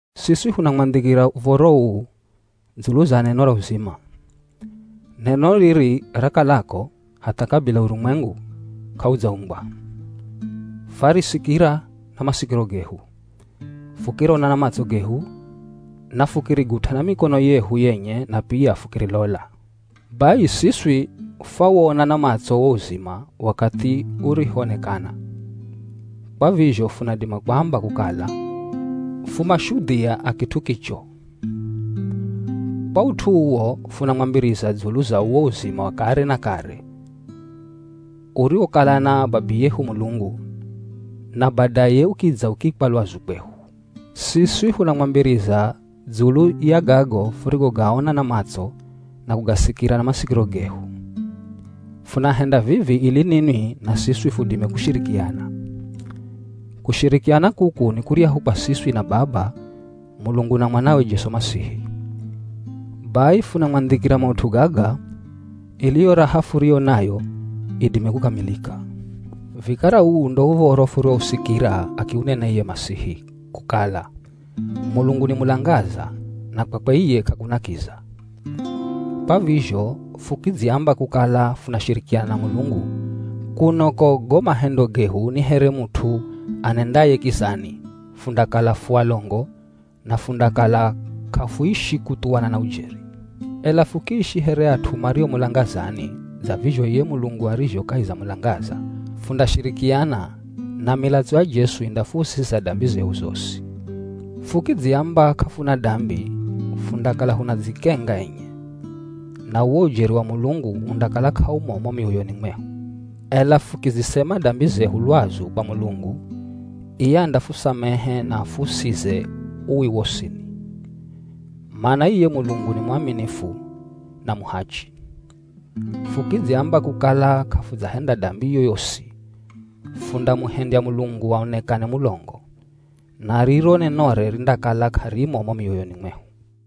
Siswi funamwandhikira uv̱oro uu dzulu za neno ra uzima. Neno riri rakalako hatha kabila urumwengu k'audzaumbwa. Fwarisikira na masikiro gehu, fukirona na matso gehu na fukirigut'a na mikono yehu yenye na pia fukirilola. Bai siswi fwawona na matso wo uzima wakathi urihoonekana, kwa vizho funadima kuamba kukala fu mashudhia a kit'u kicho. Kwa ut'u uwo funamwambiriza dzulu za uwo uzima wa kare na kare uriwokala na Babiyehu Mulungu, na badaye ukidza ukiikwa lwazu kwehu. Siswi funamwambiriza dzulu ya gago furigogaona na matso na kugasikira na masikiro gehu. Funahenda vivi ili ninwi na siswi fudime kushirikiana. Kushirikiana kuku ni kuryahu kwa siswi na Baba Mulungu na Mwanawe Jesu Masihi. Bai funamwandhikira maut'u gaga, ili yo raha furiyo nayo idime kukamilika. Vikara uu ndo uv̱oro furiwosikira akiunena iye Masihi, kukala: Mulungu ni mulangaza, na kwakwe iye k'akuna kiza. Kwa vizho fukidziamba kukala funashirikiana na Mulungu, kuno ko go mahendo gehu ni here mut'u anendaye kizani, fundakala fu alongo, na fundakala k'afuishi kuthuwana na ujeri. Ela fukiishi here at'u mario mulangazani, dza vizho iye Mulungu arizho kahi za mulangaza, fundashirikiana, na milatso ya Jesu indafuusiza dambi zehu zosi. Fukidziamba k'afuna dambi, fundakala funadzikenga enye, na uwo ujeri wa Mulungu undakala k'aumo mo mioyoni mwehu. Ela fukizisema dambi zehu lwazu kwa Mulungu, iye andafusamehe na afuusize uwi wosini. Mana iye Mulungu ni mwaminifu na muhachi. Fukidziamba kukala k'afudzahenda dambi yoyosi, fundamuhendya Mulungu aonekane mulongo, na riro nenore rindakala k'arimo mo mioyoni mwehu.